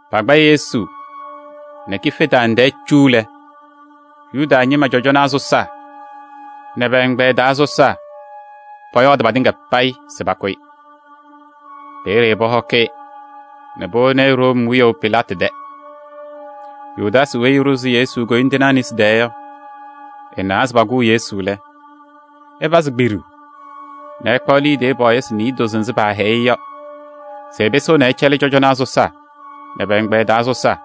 Pakpa Yesu nɛ kife tanaŋ tɛɛ cu lɛ, Yuda ñɩma cɔjɔnaa sɔsaa nɛ pɛ-ɛgbɛyɛ taa sɔsaa pɔyɔɔdɩ patɩŋa payɩ se pakʋ-ɩ. Peeye pɔhɔkɩ-ɩ nɛ powoni-i Room wiyaʋ Pilaatɩ tɛ. Yudaasɩ weyi ɛɖʋzɩ Yesu koyindinaa nesi taa yɔ, ɛnawa se pakʋʋ Yesu lɛ, ɛpazɩ kpiɖuu nɛ ɛkpaɣ liidiye pɔɔyɩsɩ niidozo nzɩ paahɛyɩ-ɩ yɔ se ɛpɩsɩɣna ɛcɛlɩ cɔjɔnaa sɔsaa nɛ pɛ-ɛgbɛyɛ taa sɔsaa.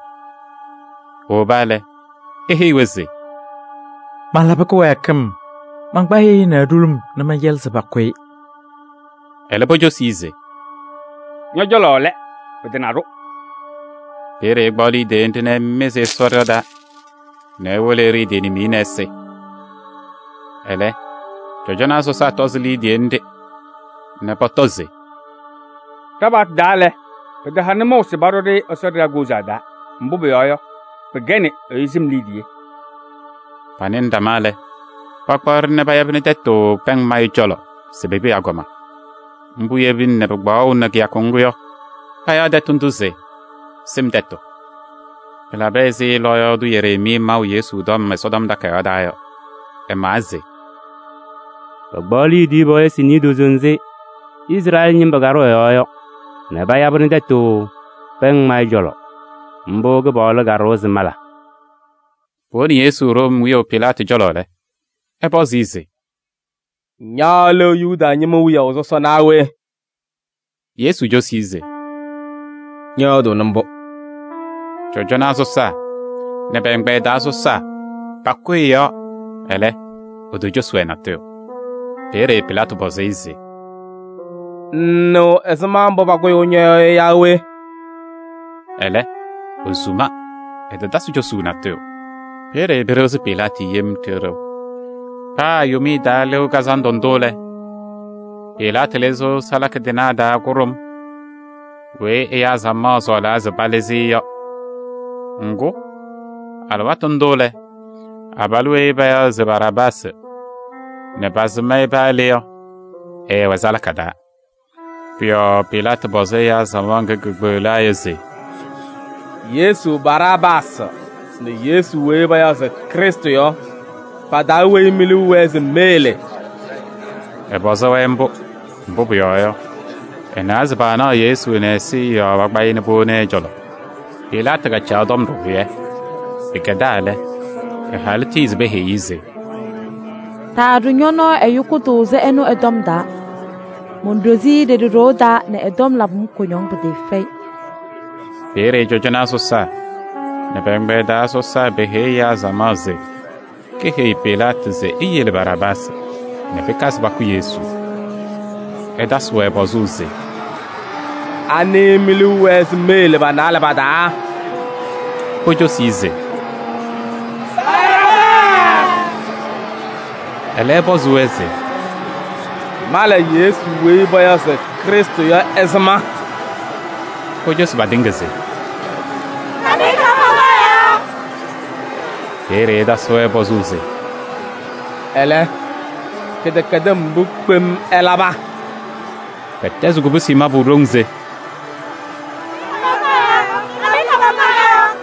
Ewoba lɛ, eheyi-wɛ se: “Malabɩ kɩwɛɛkɩm: mankpa ɛyʋ ɛnɛ ɖulum nɛ mɛncɛlɩ se pakʋ-ɩ.” Ɛlɛ pocosi-i se: “Ñɔ-cɔlɔ lɛ! Pɩtana-ɖʋ.” Peeye ɛkpaɣ liidiye nɖɩ nɛ ɛmɩzɩ Ɛsɔ ɖɩɣa taa nɛ ewolo ɛɖɩ ɛ-tɩ nimiye nɛ ɛsɩ. Ɛlɛ, cɔjɔnaa sɔsaa tɔzɩ liidiye nɖɩ nɛ pɔtɔ se: “Ɖa-paɣtʋ taa lɛ, pɩtaha nʋmɔʋ se paɖʋ-ɖɩ Ɛsɔ ɖɩɣa koozaɣ taa, mbʋ pʋyɔɔ yɔ, pɩkɛnɩ ɛyʋ sɩm liidiye.” Panɩnɩ ɖama lɛ, pakpaɣ-ɖɩ nɛ payabɩnɩ tɛtʋ pɛŋ mayʋ cɔlɔ se pepi agɔma. Mbʋ yebina nɛ pɩkpaɣʋnɩ kɩyakʋ ŋgʋ yɔ, payaɣ tɛtʋ ndʋ se: “Sɩm Tɛtʋ.” Pɩlabɩ ɛzɩ lɔɔyaɣ tʋ Yereemii maʋ Yesu tɔm Ɛsɔtɔm Takayaɣ taa yɔ. Ɛmawa se: “Pakpaɣ liidiye pɔɔyɩsɩ niidozo nzɩ Izrɛɛlɩ ñɩma ɖʋ ɛ-yɔɔ yɔ nɛ payabɩnɩ tɛtʋ pɛŋ mayʋ cɔlɔ. Mbʋ Kɩpaɣlʋ kaɖʋwa se mala.” Powoni Yesu Room wiyaʋ Pilaatɩ cɔlɔ lɛ, ɛpɔzɩ-ɩ se: “Ña lɛ Yuda ñɩma wiyaʋ sɔsɔ naa we?” Yesu cosi-i se: “Ñɔyɔɔdʋʋnɩ mbʋ.” Cɔjɔnaa sɔsaa nɛ pɛ-ɛgbɛyɛ taa sɔsaa pakʋyɩ ɛ-yɔɔ, ɛlɛ, etocosi-wɛ natʋyʋ. Peeye Pilaatɩ pɔzɩ-ɩ se: “Ŋŋnɩɣ ɛzɩma mbʋ pakʋyʋʋ ñɔ-yɔɔ yɔ yaa we?” Ɛlɛ, esuma, ɛtatasɩ cosuu natʋyʋ. Peeye pɩɖɩɣzɩ Pilaatɩ yem ɖɩɣ ɖɩɣ. Paa Yomiye Taa Lɩʋ Kazandʋ ndʋ lɛ, Pilaatɩ lɩzɩɣ salaka tɩnaa taa kʋɖʋm weyi ɛyaa samaɣ sɔɔlaa se palɩzɩ-ɩ yɔ. Ŋgʋ, alɩwaatʋ ndʋ lɛ, abalʋ weyi payaɣ se [Yesu] Baraabaasɩ nɛ pasɩm-ɩ paa le yɔ, ɛɛwɛ salaka taa. Pʋ-yɔɔ Pilaatɩ pɔzɩ ɛyaa samaɣ ŋga kekpeɣlaa yɔ se: “[Yesu] Baraabaasɩ nɛ Yesu weyi payaɣ se Krɩstʋ yɔ, pa-taa weyi mi-liu wɛɛ se meyele?” Ɛpɔzɩ-wɛ mbʋ, mbʋ pʋyɔɔ yɔ, ɛnawa se paanaɣ Yesu nɛ ɛzɩyɛ yɔɔ pakpa-ɩ nɛ powoni ɛ-cɔlɔ. Pilaatɩ kacaɣ tɔm ɖɩhʋyɛ. Pɩkɛdaa lɛ, ɛ-halʋ tiyi se peheyi-i se: “Taaɖʋ ñɔ-nɔɔ ɛyʋ kʋtʋʋzʋ ɛnʋ ɛ-tɔm taa. Monɖozi-i ɖeɖe ɖoo taa nɛ ɛ-tɔm labɩ-m kʋñɔŋ pɩtɩɩfɛyɩ.” Peeye cɔjɔnaa sɔsaa nɛ pɛ-ɛgbɛyɛ taa sɔsaa peheyi ɛyaa samaɣ se keheyi Pilaatɩ se eyele Baraabaasɩ nɛ pɩkazɩ pakʋ Yesu. Ɛtasɩ-wɛ pɔzʋʋ se: “Anɩ mi-liu wɛɛ se meyele pa-naalɛ pa-taa?” Pocosi-i se: “Baraabaasɩ!” Ɛlɛ ɛpɔzɩ-wɛ se: “Mala Yesu weyi payaɣ se Krɩstʋ yɔ ɛzɩma?” Pocosi-i patɩŋa se: “Kam-ɩ kaamaŋkaɣ yɔɔ!” Peeye ɛtasɩ-wɛ pɔzʋʋ se: “Ɛlɛ, kɩdɛkɛdɩm mbʋ kpem ɛlaba?” Pɛtɛzɩ kobusi mabʋ ɖoŋ se: “Kam-ɩ kaamaŋkaɣ yɔɔ!”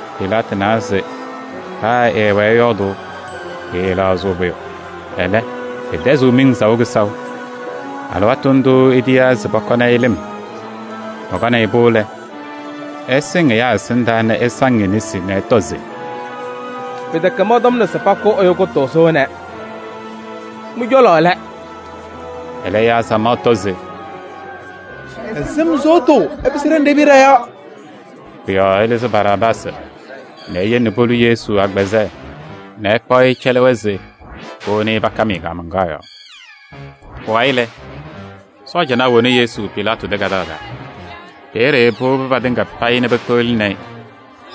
Pilaatɩ nawa se paa ɛwɛɛ ɛyɔɔdʋʋ, pɩɩlɛɣzɩɣ pʋyʋ, Ɛlɛ, pɩtɛzɩɣ miŋ saʋ kɩsaʋ. Alɩwaatʋ ndʋʋ etiyaa se pɔkɔnɩ-ɩ lɩm. Pɔkɔnɩ-pʋ lɛ, ɛsɩŋ ɛyaa ɛsɩndaa nɛ ɛsaŋ e-nesi nɛ ɛtɔ se: “Pɩtɛkɛ mɔntɔmna se pakʋ ɛyʋ kʋtʋʋzʋ ɛnɛ! Mɩ-cɔlɔ lɛ!” Ɛlɛ ɛyaa samaɣ tɔ se: “Ɛ-sɩm sʋʋtʋ ɛpɩsɩ ɖa nɛ ɖe-piya ɖɔ-yɔɔ!” Pʋ-yɔɔ ɛlɩzɩ Baraabaasɩ nɛ eyele polu Yesu agbazɛɛ nɛ ɛkpaɣ-ɩ ɛcɛlɩ-wɛ se powoni-i pakam-ɩ kaamaŋkaɣ yɔɔ. Pʋwayɩ lɛ, sɔɔjanaa woni Yesu Pilaatɩ tɛ kadaɣ taa. Peeye powobi patɩŋa payɩ nɛ pekpeɣlini-i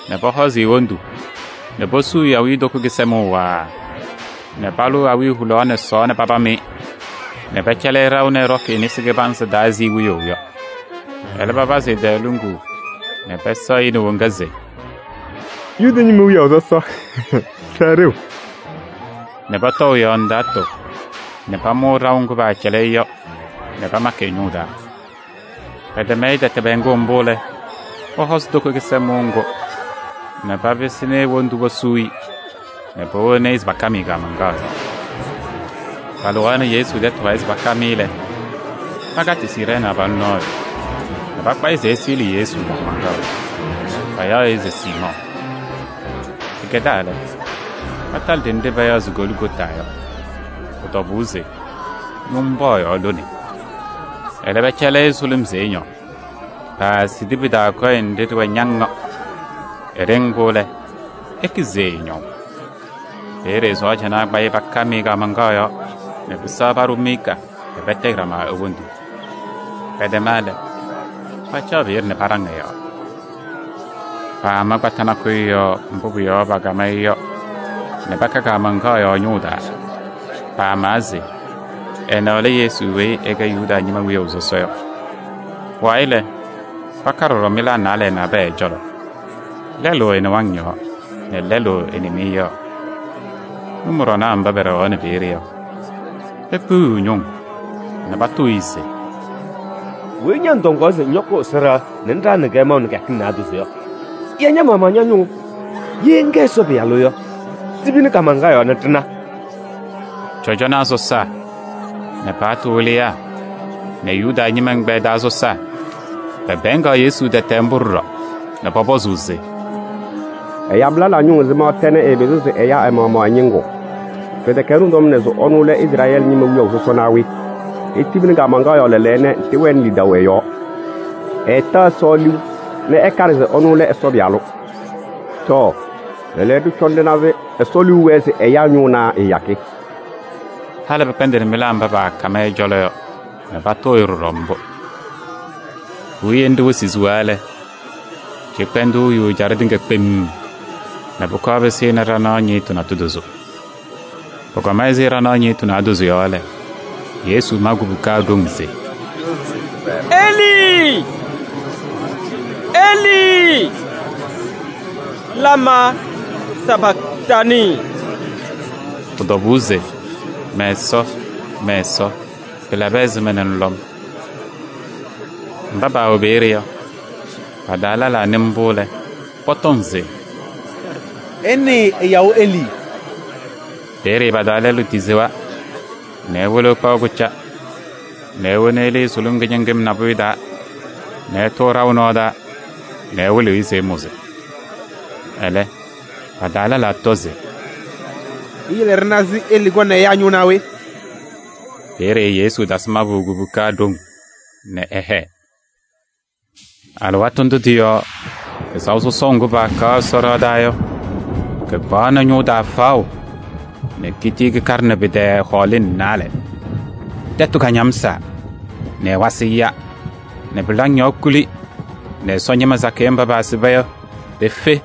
nɛ pɔhɔzɩ e-wondu nɛ posuu-i awiitoko kɩsɛmʋʋ waaa nɛ palʋʋ awiya hulaɣ nɛ sɔɔɔ nɛ papam-ɩ nɛ pɛcɛlɩ-ɩ ɖaʋ nɛ ɛɖɔkɩ e-nesi kɩbanzɩ taa ɛzɩ wiyaʋ yɔ. Ɛlɛ papazɩ ɛ-tɛɛ luŋuu nɛ pɛsɛɣ-ɩ nɛ woŋa se: “Yuda ñɩma wiyaʋ sɔsɔ! Sɛɛ ɖeu!” Nɛ pɔtɔʋ ɛ-yɔɔ ndaatʋ nɛ pamʋʋ ɖaʋ ŋgʋ paacɛlɩ-ɩ yɔ nɛ pamakɩ ɛ-ñʋʋ taa. Pɛtɛm-ɩ tɛtɛ pɛɛŋʋʋ mbʋ lɛ, pɔhɔzɩ toko kɩsɛmʋʋ ŋgʋ nɛ papɩsɩnɩ e-wondu posuu-i nɛ powoni-i se pakam-ɩ kaamaŋkaɣ yɔɔ. Palɩɣaɣnɩ Yesu tɛtʋ wayɩ se pakam-ɩ lɛ, pakatɩ Siirɛɛnɩ abalʋ nɔɔyʋ nɛ pakpa-ɩ se ɛsɩɣlɩ Yesu kaamaŋkaɣ, payaɣ-ɩ se Siimɔɔ. Pɩkɛdaa lɛ, patalɩ ɖenɖe payaɣ se Goligota yɔ, pʋ-tɔbʋʋ se ñʋmbɔɔyaɣ lone. Ɛlɛ pɛcɛlɩ-ɩ sʋlʋm se ɛñɔɔ, paasidi pɩ-taa kɔyɛ nɖɩ ɖɩwɛ ñaŋ yɔ. Ɛɖɩŋ-pʋ lɛ, ekizi se ɛɛñɔʋ. Peeye sɔɔjanaa kpa-ɩ pakam-ɩ kaamaŋkaɣ yɔɔ nɛ pɩsɛɣ paɖʋ miika nɛ patayɩ ɖama e-wondu. Pɛtɛma lɛ, pacaɣ peeye nɛ paɖaŋ ɛ-yɔɔ. Paama kpata nakʋyʋ yɔɔ mbʋ pʋ-yɔɔ pakam-ɩ yɔ nɛ paka kaamaŋkaɣ yɔɔ ɛ-ñʋʋ taa. Pamawa se: “Ɛnɛ lɛ Yesu weyi ɛkɛ Yuda ñɩma wiyaʋ sɔsɔ yɔ.” Pʋwayɩ lɛ, paka ɖɔɖɔ mɩlaa naalɛ nabɛyɛ ɛ-cɔlɔ: lɛlʋ ɛ-nɩwaŋ yɔɔ nɛ lɛlʋ ɛ-nɩmɩyɛ yɔɔ. Nʋmɔɖɔnaa mba pɛɖɛɣaɣnɩ peeye yɔ, pekpiɣyiɣ ñʋŋ nɛ patʋʋ-ɩ se: “Weyi ña ŋtɔŋaɣ se ŋyɔkʋʋ Ɛsɔ ɖɩɣa nɛ ŋɖaɣnɩ-kɛ maʋ nɛ kɩyakɩŋ naadozo yɔ, ya ña-maɣmaɣ ña-ñʋʋ! Ye ŋkɛ Ɛsɔ Pɩyalʋ yɔ, tibini kaamaŋkaɣ yɔɔ nɛ ɖɩna!” Cɔjɔnaa sɔsaa nɛ paɣtʋ wɩlɩyaa nɛ Yuda ñɩma ɛgbɛyɛ taa sɔsaa pɛpɛɛŋaɣ Yesu tɛtɛ mbʋ ɖɔɖɔ nɛ pɔpɔzʋʋ se: “Ɛyabɩ lɛlaa ñʋŋ ɛzɩma tɛ, ɛɛpɩzɩɣ se ɛya ɛ-maɣmaɣ ɛ-ñɩŋgʋ! Pɩtɛkɛ ɛnʋ tɔmna se ɛnʋ lɛ Izrɛɛlɩ ñɩma wiyaʋ sɔsɔ naa we? Etibini kaamaŋkaɣ yɔɔ lɛɛlɛɛyɔ nɛ ɖɩwɛnɩ lidaʋ ɛ-yɔɔ! Ɛɛta Ɛsɔ liu nɛ ɛkaɖɩ se ɛnʋ lɛ Ɛsɔ Pɩyalʋ. Tɔɔ! Lɛɛlɛɛyɔ, ɖɩcɔna ɖɩna se Ɛsɔ liu wɛɛ se ɛya ɛ-ñʋʋ naa ɛɛyakɩ?” Halɩ pɩkpɛndɩnɩ mɩlaa mba paakam ɛ-cɔlɔ yɔ nɛ patʋʋ-ɩ ɖɔɖɔ mbʋ. Puwiye nɖɩ wɩsɩ siɣa lɛ, cɩkpɛndʋʋ yu ɛjaɖɛ tɩŋa kpemm nɛ pʋkɔɔ pɩsɩnɩ ɖanaɣ ñɩɣtʋ naadozo. Pʋkɔma ɛzɩ ɖanaɣ ñɩɣtʋ naadozo yɔ lɛ, Yesu ma kubuka ɖoŋ se: “Elii, Elii! Lamaa sapaktanɩɩ.” Pʋ-tɔbʋʋ se: “Mɛ-Ɛsɔ, Mɛ-Ɛsɔ! Pɩlabɩ ɛzɩma nɛ ŋlɔ-m?” Mba paawɛ peeye yɔ, pa-taa lɛlaa nɩ mbʋ lɛ, pɔtɔŋ se: “Ɩnɩɩ ɛyaɣʋ Elii!” Peeye pa-taa lɛlʋ tisewa nɛ ewolo ɛkpaɣ kʋca nɛ ewona elii sʋlʋm kɩñɩŋɩm nabʋyʋ taa nɛ ɛtʋʋ ɖaʋ nɔɔ taa nɛ ɛwɩlɩɣ-ɩ se ɛmʋzɩ. Ɛlɛ, pa-taa lɛlaa tɔ se: “Iyele ɖɩna se Elii kɔŋ nɛ ɛya ɛ-ñʋʋ naa we?” Peeye Yesu tasɩ mabʋ kubuka ɖoŋ nɛ ɛhɛɛ. Alɩwaatʋ ndʋ tɩ-yɔɔ pɩsaʋ sɔsɔʋ ŋgʋ paakaɣ Ɛsɔ ɖɩɣa taa yɔ, kɩkpaɣnɩ ñʋʋ taa faɣʋ nɛ kitii kɩkaɖɩnɩ pɩ-tɛɛ hɔɔlɩŋ naalɛ. Tɛtʋ kañamsaa nɛ ɛwasɩ ya nɛ pɩlaŋ yɔɔ kuli nɛ Ɛsɔ ñɩma sakɩyɛ mba paasɩba yɔ, pefe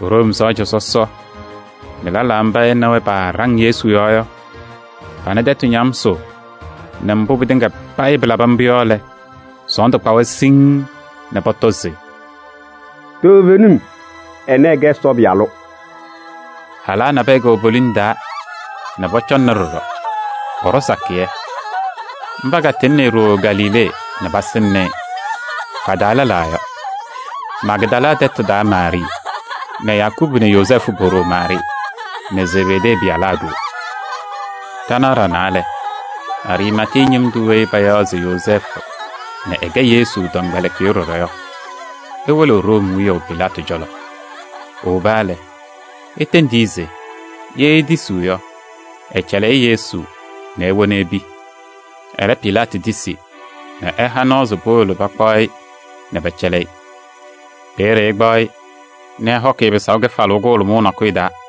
Room sɔɔja sɔsɔ nɛ lɛlaa mba ɛ nɛ wɛ paaɖaŋ Yesu yɔɔ yɔ, pana tɛtʋ ñamsʋʋ nɛ mbʋ pɩtɩŋa payɩ pɩlabɩ mbʋ yɔ lɛ, sɔɔndʋ kpa-wɛ siŋŋ nɛ pɔtɔ se: “Toovenim, ɛnɛ ɛɛkɛ Ɛsɔ Pɩyalʋ!” Halaa nabɛyɛ kɛwɛ poliŋ taa nɛ pɔcɔŋnɩ ɖɔɖɔ, pɔɖɔ sakɩyɛ. Mba katɩŋnɩ-ɩ nɛ ɖooo Galilee nɛ pasɩŋnɩ-ɩ. Pa-taa lɛlaa yɔ: Magdala tɛtʋ taa Maarɩɩ nɛ Yakubu nɛ Yozɛɛfʋ po-ɖoo Maarɩɩ nɛ Zebedee pɩyalaa ɖoo. Ɖanaɣ ɖanaa lɛ, Ariimatee ñɩm tʋ weyi payaɣ se Yozɛɛfʋ nɛ ɛkɛ Yesu tɔmkpɛlɩkɩyʋ ɖɔɖɔ yɔ, ewolo Room wiyaʋ Pilaatɩ cɔlɔ. Ewoba lɛ, etendi-i se ye etisiɣ yɔ, ɛcɛlɩ-ɩ Yesu nɛ ewona epi. Ɛlɛ Pilaatɩ tisi nɛ ɛha nɔɔ se powolo pakpaɣ-ɩ nɛ pɛcɛlɩ-ɩ. Peeye ɛkpaɣ-ɩ nɛ ɛhɔkɩ-ɩ pɩsaʋ kɩfalʋʋ kʋhʋlʋmʋʋ nakʋyʋ taa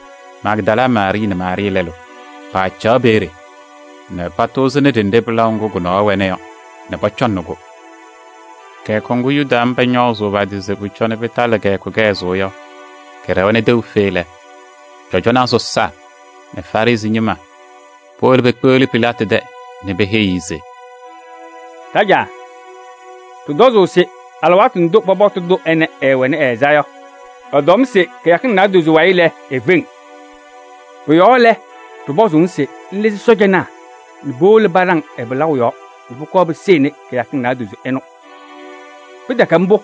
Magdala Maarɩɩ nɛ Maarɩɩ lɛlʋ paacaɣ peeye nɛ patʋʋzɩnɩ ɖenɖe pɩlaʋ ŋgʋ kʋ-nɔɔ wɛna yɔ nɛ pɔcɔŋnɩ-kʋ. Kɩyakʋ ŋgʋ Yuda ñɩma ñɔɔzʋʋ pa-tɩ se pʋcɔ pɩtalɩ kɩyakʋ kɩhɛzʋʋ yɔ, kɩɖɛwa nɛ tɛʋ fe lɛ, cɔjɔnaa sɔsaa nɛ Farɩsɩ ñɩma powolo pekpeɣli Pilaatɩ tɛ nɛ peheyi-i se: “Ɖajaa! Ɖɩtɔzʋʋ se alɩwaatʋ ndʋ pɔbɔtʋ ɛnɛ ɛɛwɛnɩ ɛ-ɛza yɔ, ɛtɔm se kɩyakɩŋ naadozo wayɩ lɛ, efeŋ. Pʋ-yɔɔ lɛ, ɖɩpɔzʋʋ-ŋ se ŋlɩzɩ sɔɔjanaa nɛ powolo paɖaŋ ɛ-pɩlaʋ yɔɔ nɛ pʋkɔɔ pɩsɩnɩ kɩyakɩŋ naadozo ɩnʋ. Pɩtɛkɛ mbʋ,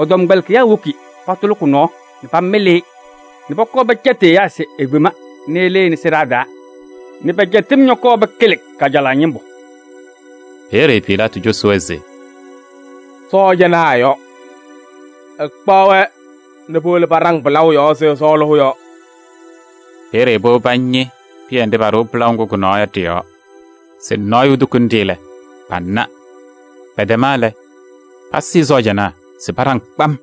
ɛ-tɔmkpɛlɩkɩyaa woki patʋlɩ kʋ-nɔɔ nɛ pamɩlɩ-ɩ nɛ pɔkɔɔ pɛcɛtɩ ɛyaa se efema nɛ ɛlɩnɩ sɩɖaa taa nɛ pɛ-cɛtɩm ñɔkɔɔ pɩkɩlɩ kajalaɣ ñɩmbʋ.” Peeye Pilaatɩ cosi-wɛ se: “Sɔɔjanaa yɔ! Ɩkpaɣ-wɛ nɛ powolo paɖaŋ pɩlaʋ yɔɔ ɛzɩ ɩsɔɔlʋʋ yɔ.” Peeye powobi pañɩ pɩyɛ nɖɩ paɖɩɣ pɩlaʋ ŋgʋ kʋ-nɔɔ yɔ ɖɩ-yɔɔ se nɔɔyʋ etukuni-ɖɩ lɛ, pana. Pɛtɛma lɛ, pasɩɩ sɔɔjanaa se paɖaŋ kpam.